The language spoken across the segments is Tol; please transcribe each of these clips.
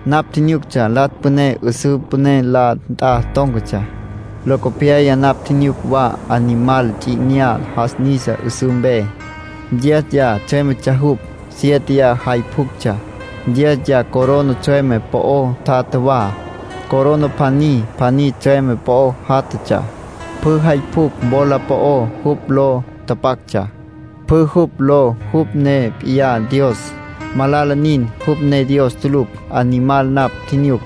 Napj tjinyuctsja Latsj Püné 'üsǘ püné la nt'a tón̈catsja. Locopyaya napj tjinyuc wa Animal Ts'i 'Inyá jas nisa 'üsǘ mpe. Diéziya tsjüémetsja jupj, siéteya jay pjuctsja. Diéziya corona tsjüeme po'o tjatja wa. Corona pjaní pjaní tsjüeme po'o játjatsja. Pjü jay pjucj wola po'ó jupj ló tapactsja. Pjü jupj ló jupj ne p'iyá Dios. Malala nin; jupj ne Dios tulucj. Animal napj tjinyuc,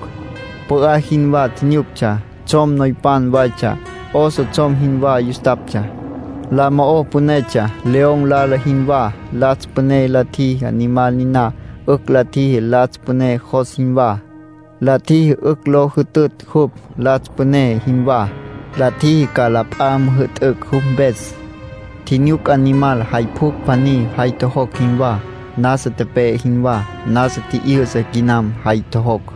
pü'á jinwá tjinyuctsja. Tsjom noypan waytsja, oso tsjom jinwá yustaptsja. La mo'ó pünetsja, león lala jinwá. Latsj Püné la tjiji Animal niná 'ücj la tjiji Latsj Püné jos jinwá. La tjiji 'ücj lo jütütj jupj, Latsj Püné jinwá. La tjiji ca la p'a müjü'tücj jupj mpes. Tjinyuc Animal jay pjucj pjaní jay tjojocj jinwá, nasa tepe'e jinwá. Nasa tji'yü'sa quinam jay tjojocj,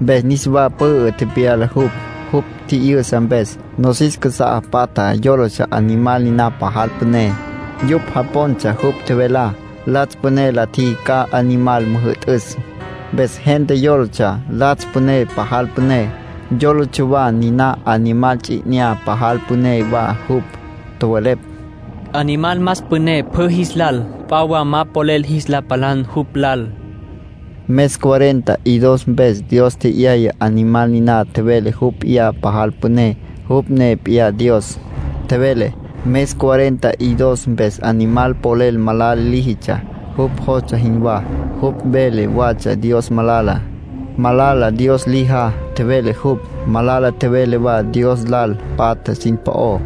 mpes niswa pü'ü tepyala jupj. Jupj tji'yü'sa mpes, nosis casá patjá yólatsja Animal niná pajal püné. Yupj japontsja jupj tjevelá. Latsj Püné la tjiji ca Animal müjü'tüs, mpes gente yólatsja Latsj Püné pajal püné. Yólatsja wa niná Animal Ts'i 'Inyá pajal püné wa jupj. Tjowelepj: “Animal más püné pjü jis lal. P'a wa ma polel jis la palan jupj lal.” Mes cuarenta y dos mpes Dios tje'yaya Animal niná tjevele jupj p'iyá pajal püné; jupj ne p'iyá Dios, tjevele. Mes cuarenta y dos mpes Animal polel malala líjitsja, jupj jostsja jinwá. Jupj vele watsja Dios malala. Malala Dios lijá, tjevele jupj. Malala tjevele wa Dios lal patja sin po'ó.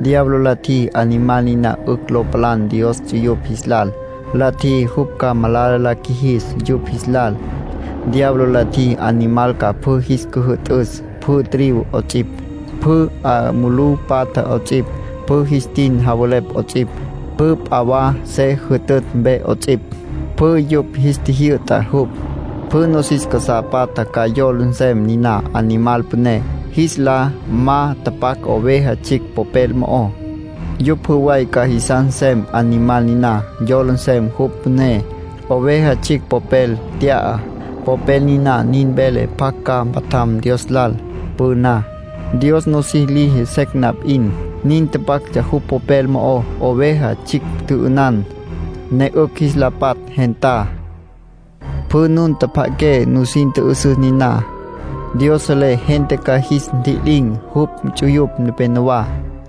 Diablo la tjiji Animal niná 'ücj lo palan Dios ts'uyupj jis lal. La tjiji jupj ca malala la qjuijis yupj jis lal. Diablo la tjiji Animal ca pjü jis cüjü'tüs. Pjü tribu 'ots'ipj, pjü 'a mulú patja 'ots'ipj, pjü jis tin javelepj 'ots'ipj, pjü p'a wa se jütütj mpe 'ots'ipj; pjü yupj jis tjijyü'ta jupj. Pjü nosis casá patja ca yola nsem niná Animal püné. Jis lá ma tapac Oveja Tsjicj popel mo'ó, yupj pjü way ca jisas nsem Animal niná, yola nsem jupj püné. Oveja Tsjicj popel tya'a, popel niná nin vele pjac ca mpatjam Dios lal. Püna, Dios nosis liji secj na p'in, nin tapactsja jupj popel mo'ó. Oveja Tsjicj tjü'ünan, ne 'ücj jis la patj gentá. Pjü nun tjapja'aqué, nusin tjü'üsüs niná. Dios selé gente ca jis ntji'lin̈ jupj ts'uyupj nepenowá,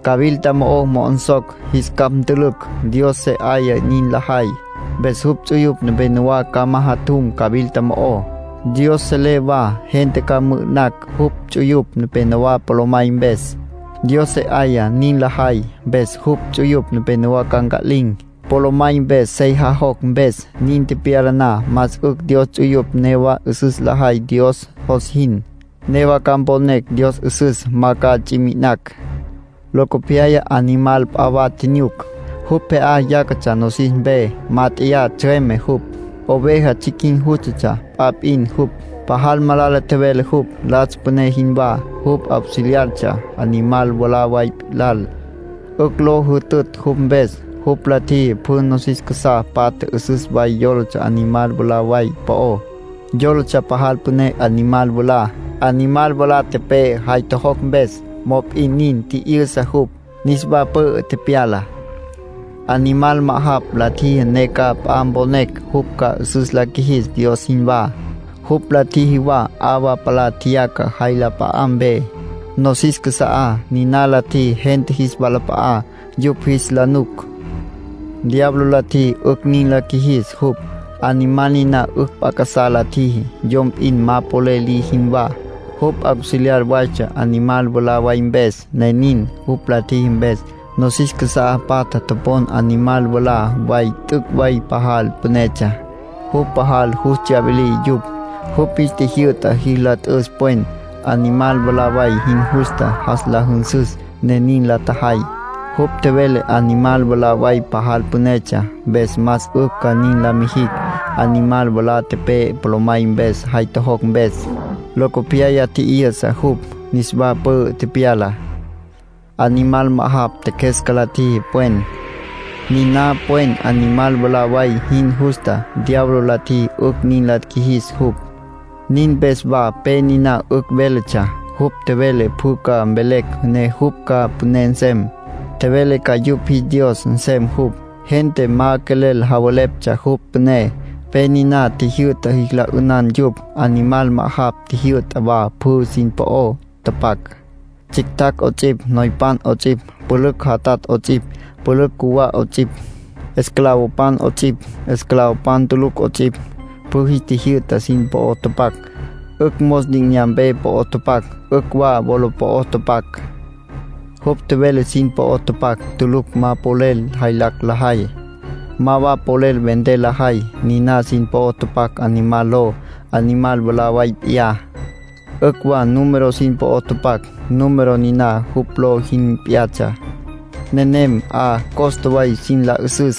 cawilta mo'o mo'onsocj, jis capj ntülücj. Dios se 'aya nin lajay, mpes jupj ts'uyupj nepenowá ca majatjum cawilta mo'ó. Dios selé wa gente ca mü'ü'nacj jupj ts'uyupj nepenowá polomay mpes. Dios se 'aya nin lajay, mpes jupj ts'uyupj nepenowá ca nca'lin̈, polomay mpes sey jajocj mpes. Nin tepyala na, más 'ücj Dios ts'uyupj newa 'üsüs lajay Dios jos jin. Newa ca mponecj Dios 'üsüs. Ma ca ts'i mi'inacj. Locopyaya animal p'a wa tjinyuc. Jupj pje'á yácatsja nosis mpe. Mát'eya tsjüeme jupj. Oveja tsjicj jin jústatsja; p'a p'in jupj. Pajal malala tjevele jupj, latsj püné jinwá. Jupj auxiliartsja animal mwalá way lal, 'ücj lo jütütj jupj mpes. Jupj la tjiji pjü nosis casá patja 'üsüs way yólatsja animal mwalá way po'ó. Yólatsja pajal püné animal mwalá. Animal mwalá tepe'e jay tjojocj mpes; mop'in nin, tji'yü'sa jupj, niswa pü'ü tepyala. Animal ma'ajapj la tjiji ne ca p'a mponecj jupj ca 'üsüs la qjuijis Dios jinwá. Jupj la tjiji wa 'awa palá tjeyaca jay la p'a'á mpe, nosis casa'á. Niná la tjiji gente jis walap'a'á, yupj jis la nuc. Diablo la tjiji 'ücj nin la qjuijis jupj. Animal niná 'ücj p'a casá la tjiji, yom p'in ma polel liji jinwá; jupj auxiliar waytsja animal mwalá way mpes, ne nin. Jupj la tjiji mpes, nosis casá patja topon animal mwalá way t'üc' way pajal pünetsja. Jupj pajal yus tsyawilí yupj. Jupj jis tjijyü'ta jis la t'üs pwen, animal mwalá way jin justa jas la jünsüs, ne nin la tjajay. Jupj tjevele animal mwalá way pajal pünetsja, mpes más 'ücj ca nin la mijicj. Animal mwalá tepe'e polomay mpes jay tjojocj mpes; locopyaya tji'yü'sa jupj, niswa pü'ü tepyala. Animal ma'ajapj tjeqjuesca la tjiji pwen, niná pwen animal mwalá way jin justa. Diablo la tjiji 'ücj nin la qjuijis jupj. Nin mpes wa pe niná 'ücj véletsja. Jupj tjevele pjü ca mvelecj ne jupj ca püné nsem. Tjevele ca yupj jis dios nsem jupj. Gente ma quelel javeleptsja jupj püné, pe niná tjijyü'ta jis la 'ünan yupj. Animal ma'ajapj tjijyü'ta wa pjü sin po'o tapac. Tsjictjacj 'ots'ipj, noypan 'ots'ipj, pülücj jatatj 'ots'ipj, pülücj cjuwá 'ots'ipj, esclavopan 'ots'ipj, esclavopan tulucj 'ots'ipj, pjü jis tjijyü'ta sin po'o tapac. 'Ücj mos li'inyampe po'o tapac, 'ücj wa wola po'o tapac. Jupj tjevele sin po'o tapac tulucj ma polel jaylacj lajay, ma wa polel vender lajay. Niná sin po'o tapac Animal ló, animal mwalá way p'iyá. 'Ücj wa número sin po'o tapac, número niná jupj ló jin p'iyatsja. Nenem 'a costa way sin la 'üsüs.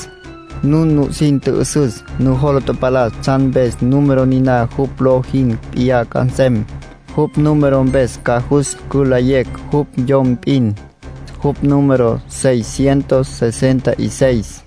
Nun nusin tjü'üsüs, nujola tapalas tsjan mpes número niná jupj ló jin p'iyá ca nsem. Jupj número mpes ca jus cülayecj jupj yom p'in. Jupj número seis cientos sesenta y seis.